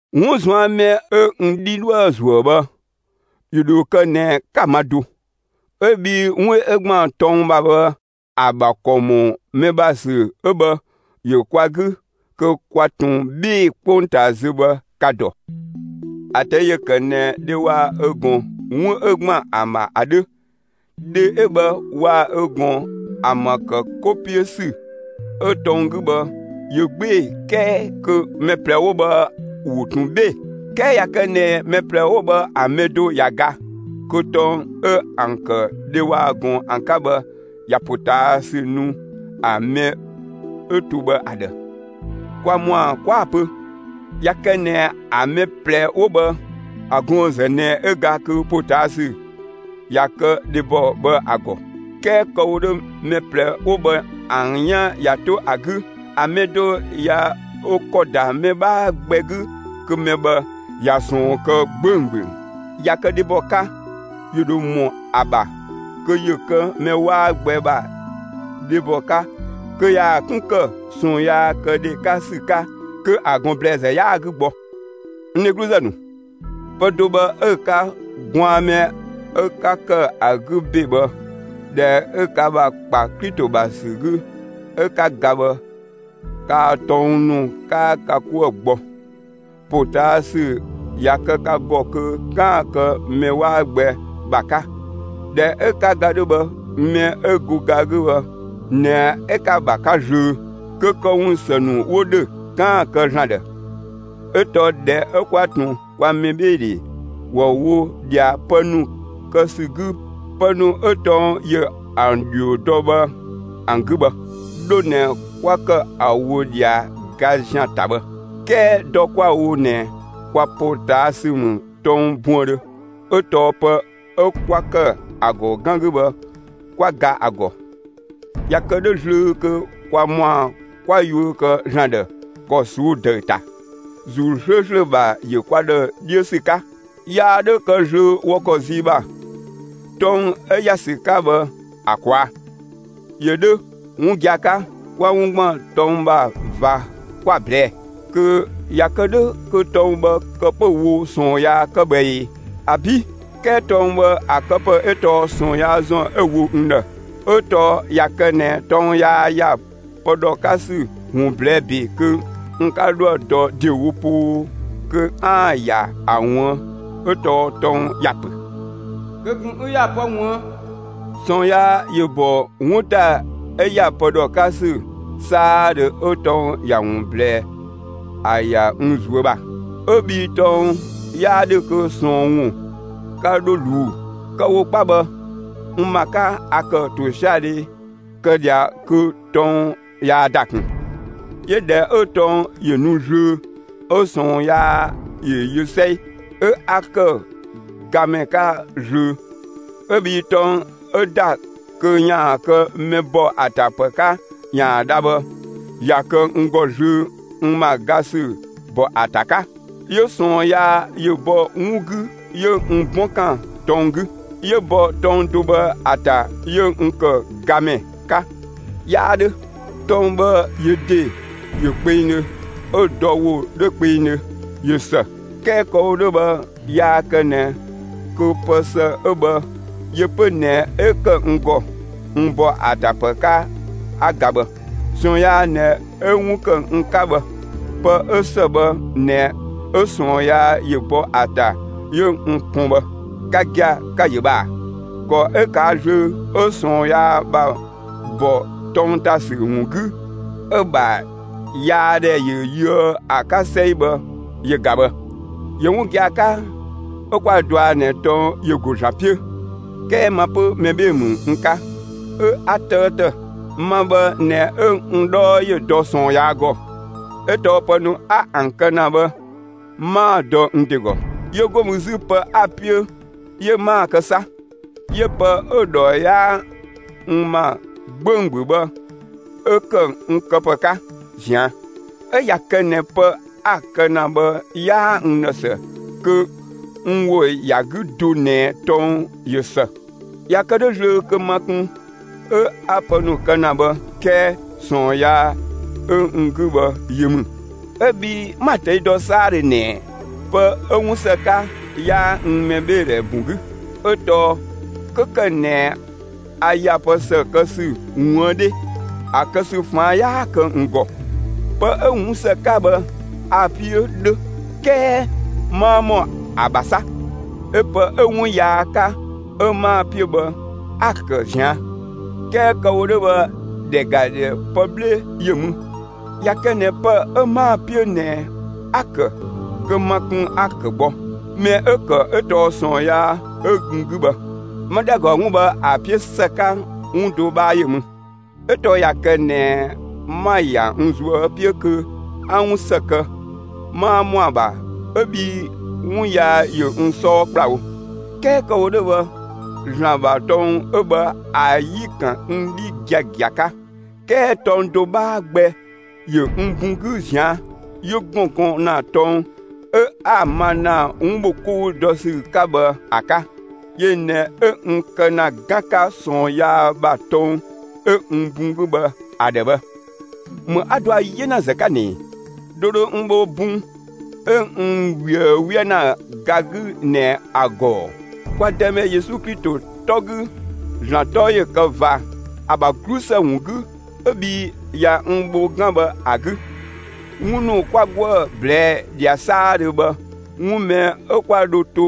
'Wun ꞊zuan' mɛ 'ö n 'dhi 'dhoë‑ ‑zuö bhë ‑yö ‑dho kë ꞊nɛ 'ka‑ ma do; 'ö bhii 'wun 'ö ‑gban tɔng ‑bha bhë, ‑a ‑bha ‑kɔ ‑mɔ mɛ ‑bha ‑sü 'ö bhë, ‑yö kwa 'gü kö kwa ꞊tun 'bhee‑ 'kpongtaa zö bhë ka‑ ‑dɔ. ‑A ꞊tɛi' ‑yö ‑kë ꞊nɛ dhe waa‑ ö ꞊gɔn, 'wun 'ö ‑gban ‑an ‑bha ‑a 'dhö; dhe 'ö bhë, waa‑ ö ꞊gɔn ‑an ‑bha ‑kë 'ko 'piö ‑sü 'ö tɔng 'gü bhë, ‑yö 'gbee‑ 'kɛɛ kö mɛ ꞊plɛ 'wo bhë ‑wo ꞊tun 'bhee‑. 'Kɛɛ ꞊ya kë ꞊nɛ mɛ ꞊plɛ 'wo bhë ‑a mɛ do ꞊ya ga, kö tɔng 'ö ‑an ‑kë dhe waa‑ ꞊gɔn ‑an 'ka bhë, ꞊ya ‑potaasü nu ‑a mɛ 'ö to bhë ‑a ‑dhë. Kwa ‑mɔa 'kwa‑ pö, ꞊ya kë ꞊nɛ ‑a mɛ ꞊plɛ 'wo bhë, ‑a gɔɔn‑ ‑zë ꞊nɛ 'ö ga kö ‑potaasü ꞊ya kë dhebɔ bhë ‑a ‑gɔ. 'Kɛɛ kë‑ wo 'dhö, mɛ ꞊plɛ 'wo bhë ‑an 'yan ꞊ya 'to ‑a 'gü, ‑a mɛ do ꞊ya ö ‑kɔ ‑da mɛ 'bhaa gbɛ 'gü kö mɛ bhë, ꞊ya ꞊sɔɔn kë 'gbönggböng. ꞊Ya kë dhebɔ 'ka, ‑yö ‑dho ‑mɔ ‑a ‑bha kö ‑yö kë mɛ 'waa gbɛ ‑bha dhebɔ 'ka kö ‑yaan 'kun ‑kë ꞊sɔɔnkëdhe 'ka ‑sü 'ka kö ‑a ꞊gɔn ‑blɛɛzë 'yaa‑ 'gü gbɔ. N dhegluzë ‑nu, pë do bhë 'ö‑ 'ka; gwaan mɛ 'ö 'ka ‑kë ‑a 'gü ‑be bhë, ꞊dhɛ 'ö ka ‑bha ‑kpa Klito ‑bha ‑sü 'gü 'ö 'ka ga bhë, kaa‑ tɔng ‑nu, 'kaa ka 'kuë‑ gbɔ; ‑potaasü ꞊ya kë ka ‑gɔ kö 'kaan‑ kë mɛ 'waa gbɛ ‑bha 'ka. ꞊Dhɛ 'ö 'ka ga 'dhö bhë, mɛ 'ö go ga 'gü bhë ꞊nɛ 'ö 'ka‑ ‑bha 'ka zlöö, kö këwun ‑së ‑nu 'wo ‑dhö, 'kaan‑ ‑an kë ‑Zlan ‑dhë. 'Ö tɔɔ ꞊dhɛ 'ö 'kwa ꞊tun kwa mɛbheedhe ‑wɔ wo ꞊dhia pë ‑nu kë ‑sü 'gü pë ‑nu 'ö tɔng ‑yö ‑an ‑dhio dɔ bhë ‑an 'gü bhë, 'dho ꞊nɛ 'kwa ‑kë ‑a wo ꞊dhia ga ‑zian ‑ta bhë. 'Kɛɛ dɔ 'kwa‑ wo ꞊nɛ kwa ‑potaasü ‑mü tɔng buëndhö; 'ö tɔɔ pë 'ö 'kwa ‑kë ‑a ‑gɔ 'gan 'gü bhë, kwa ‑ga ‑a ‑gɔ. ꞊Ya kë 'dhö zlöö kö kwa ‑mɔa 'kwa yuö ‑kë ‑Zlan ‑dhë ‑kɔ ꞊suu'‑ ‑dëü ‑ta, ‑Zuu 'slööslö ‑bha ‑yö kwa ‑dhë 'dhiö ‑sü 'ka. Yaa 'dhö kë zlöö wɔ ‑kɔ zii ‑bha, tɔng 'ö ꞊ya ‑sü 'ka bhë ‑a ꞊kwaa'. ‑Yö 'dhö 'wun gia‑ 'ka; 'kwa 'wun ‑gban tɔng ‑bha ꞊va 'kwa‑ ꞊blɛɛ. Kö ꞊ya kë 'dhö, kö tɔng bhë kë 'pö‑ wo ꞊sɔɔn yaa 'ka bhë ꞊ee? ‑Abi'! 'Kɛɛ tɔng bhë ‑a këpë 'ö tɔɔ ꞊sɔɔn yaa ‑zɔn 'ö‑ wo n ‑dhë. 'Ö tɔɔ ꞊ya kë ꞊nɛ tɔng yaa ‑ya pë ‑dhɔ 'ka ‑sü ‑wun ꞊blɛɛ' ‑be kö n 'ka 'dhoë‑ dɔ ‑dewo poo kö 'aan‑ ‑ya ‑a ꞊wuën', 'ö tɔɔ tɔng ‑ya pö: Kö ꞊kun 'ü ‑ya pë ꞊wuën'. ꞊Sɔɔn yaa yö ‑bɔ 'wun ‑ta 'ö ‑ya pë ‑dhɔ 'ka ‑sü 'saadhö 'ö tɔng ‑ya ‑wun ꞊blɛɛ ‑a ‑ya n ꞊zuö' ‑bha; 'ö bhii tɔng 'yaa 'dhö kö ꞊sɔɔn ‑wun 'ka 'dho ꞊luu'‑. Kë‑ wo 'kpa bhë, n ‑ma 'ka, a ‑kë ‑tosiadhe kë ꞊dhia kö tɔng yaa ‑da ꞊kun. 'Yö ꞊dhɛ 'ö tɔng ‑yö nu zlöö 'ö ꞊sɔɔn yaa ‑yö yö 'sɛi, 'ö 'a ‑kë gamɛ 'ka zlöö; 'ö bhii tɔng 'ö ‑da kö ‑yaan kë mɛ ‑bɔ ‑a ‑ta ‑pë 'ka ‑yaan dha bhë, ꞊ya kë n ‑gɔ zlöö n ‑ma ga ‑sü ‑bɔ ‑a ‑ta 'ka; 'yö ꞊sɔɔn yaa ‑yö bɔ 'wun 'gü 'yö n 'bɔn ‑kan tɔng 'gü; 'yö bɔ tɔng do bhë ‑a ‑ta 'yö n ‑kë gamɛ 'ka. 'Yaa 'dhö, tɔng bhë yö ‑de ‑yö kpengdhö, 'ö‑ dɔ ‑wo 'dhö kpengdhö; ꞊yö ‑së. 'Kɛɛ kë‑ wo 'dhö bhë, yaa kë ꞊nɛ kö pë ‑së 'ö bhë yö 'pö ꞊nɛ 'ö ‑kë n ‑gɔ n ‑bɔ ‑a ‑ta ‑pë 'ka 'a ga bhë. ꞊Sɔɔn yaa ꞊nɛ 'ö 'wun ‑kë n 'ka bhë. Pë 'ö ‑së bhë ꞊nɛ 'ö ꞊sɔɔn yaa ‑yö bɔ ‑a ‑ta 'ö n pɔn bhë. Ka gia‑, ka‑ ‑yö bhë ꞊aa! ‑Kɔ 'ö ꞊kaa' zlöö 'ö ꞊sɔɔn yaa ‑bha ‑bɔ tɔng ‑ta ‑sü ‑wun 'gü 'ö‑ ‑bha yaadhɛ ya yöë ‑a 'ka 'sɛi bhë yö ꞊ga bhë. ‑Yö 'wun gia‑ 'ka 'ö 'kwa‑ dɔa ꞊nɛ tɔng ‑yö ‑go ‑Zlan 'piö; 'kɛɛ ma 'pö mɛ 'bhee‑ ‑mü n 'ka, 'ö 'a 'tëëtë. Ma bhë ꞊nɛ 'ö n 'dhɔɔ ‑yö dɔ ꞊sɔɔn yaa ‑gɔ. 'Ö tɔɔ pë ‑nu 'a ‑an kë ‑na bhë 'maa‑ dɔ n ‑de ‑gɔ. 'Yö 'go mü 'zü, pë 'a‑ 'piö, 'yö 'maa‑ kë 'sa; 'yö pë 'ö‑ ‑dhɔ 'yaa n ‑ma 'gbönggböng bhë 'ö ‑kë n këpë 'ka ꞊zian'. 'Ö ꞊ya kë ꞊nɛ pë 'a‑ kë ‑na bhë, 'yaa n ‑dhë ‑së, kö n ‑wo ‑ya 'gü do ꞊nɛ tɔng ꞊yö ‑së. ꞊Ya kë 'dhö zlöö kö ma kun 'ö 'a pë ‑nu kë ‑na bhë; 'kɛɛ ꞊sɔɔn yaa 'ö n 'gü bhë yö ‑mü; 'Ö bhii 'ma‑ ꞊tɛi' dɔ 'saadhö ꞊nɛ pë 'ö 'wun ‑së 'ka, 'yaa n mɛbheedhɛ bun 'gü, 'ö tɔɔ 'kö ‑kë ꞊nɛ a ‑ya pë ‑së kë ‑sü ꞊wuën' 'dhe, ‑a kë ‑sü ‑faan 'yaa kë n ‑gɔ. Pë 'ö 'wun ‑së 'ka bhë, a‑ 'piö 'dhö; 'kɛɛ 'maa ‑mɔ ‑a ‑bha 'sa; 'yö pë 'ö 'wun yaa 'ka 'ö 'maa‑ 'piö bhë, 'a‑ ‑kë ꞊zian'. 'Kɛɛ kë‑ wo 'dhö bhë, ‑dhɛ ‑ga ‑dhɛ pë 'bhle ‑yö ‑mü: ꞊Ya kë ꞊nɛ pë 'ö 'maa‑ 'piö ꞊nɛ 'a‑ ‑kë, kö ma kun 'a‑ ‑kë gbɔ. Mɛ 'ö‑ ‑kë 'ö tɔɔ ꞊sɔɔn yaa 'ö n 'gü bhë. 'Ma ‑dhɛ ‑ga 'wun bhë ‑a 'piö ‑së 'ka, 'wun do 'bhaa ‑yö mü; 'ö tɔɔ ꞊ya kë ꞊nɛ 'ma‑ ‑ya n ꞊zuö' 'piö kö 'a 'wun ‑së kë, 'maa ‑mɔa ‑bha, 'ö bhii 'wun yaa ‑yö n 'sɔɔ ‑kplawo. 'Kɛɛ kë‑ wo 'dhö bhë, ‑Zlan ‑bha tɔng 'ö bhë ‑a 'yi‑ ‑kan n 'dhi giagia 'ka, 'kɛɛ tɔng do 'bhaa gbɛ ‑yö n bun 'gü ꞊zian'; 'yö ‑gɔn gɔn ‑na tɔng 'ö 'a‑ ma ‑na 'wun ‑bho 'kou ‑dɔ ‑sü 'ka bhë ‑a 'ka. Yö ꞊nɛ 'ö n kë ‑na 'gan 'ka ꞊sɔɔn yaa ‑bha tɔng 'ö n bun 'gü bhë ‑a ‑dhë bhë. ‑Më 'a dɔa 'yenazë 'ka ꞊nɛ! Dö dho n bho bun 'ö n ꞊wië 'wië ‑na ga 'gü ꞊nɛ ‑a ‑gɔ ‑oo? Kwa Dëmɛ Yesu Klito 'tɔ 'gü, ‑Zlan 'tɔ ‑yö kë ꞊va ‑a ‑bha 'glusë ‑wun 'gü 'ö bhii ꞊ya n bho 'gan bhë ‑a 'gü. 'Wun ‑nu 'kwa 'goë‑ ꞊blɛɛ' ꞊dhia 'saadhö bhë, 'wun mɛ 'ö 'kwa dho to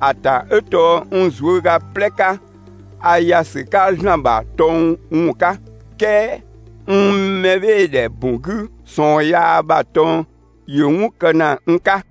‑a ‑ta 'ö tɔɔ n ꞊zuöga 'plɛ 'ka, a ‑ya ‑sü 'ka ‑Zlan ‑bha tɔng ‑wun 'ka, 'kɛɛ n mɛbheedhe ‑bun 'gü ꞊sɔɔn yaa ‑bha tɔng ‑yö 'wun kë ‑na n 'ka.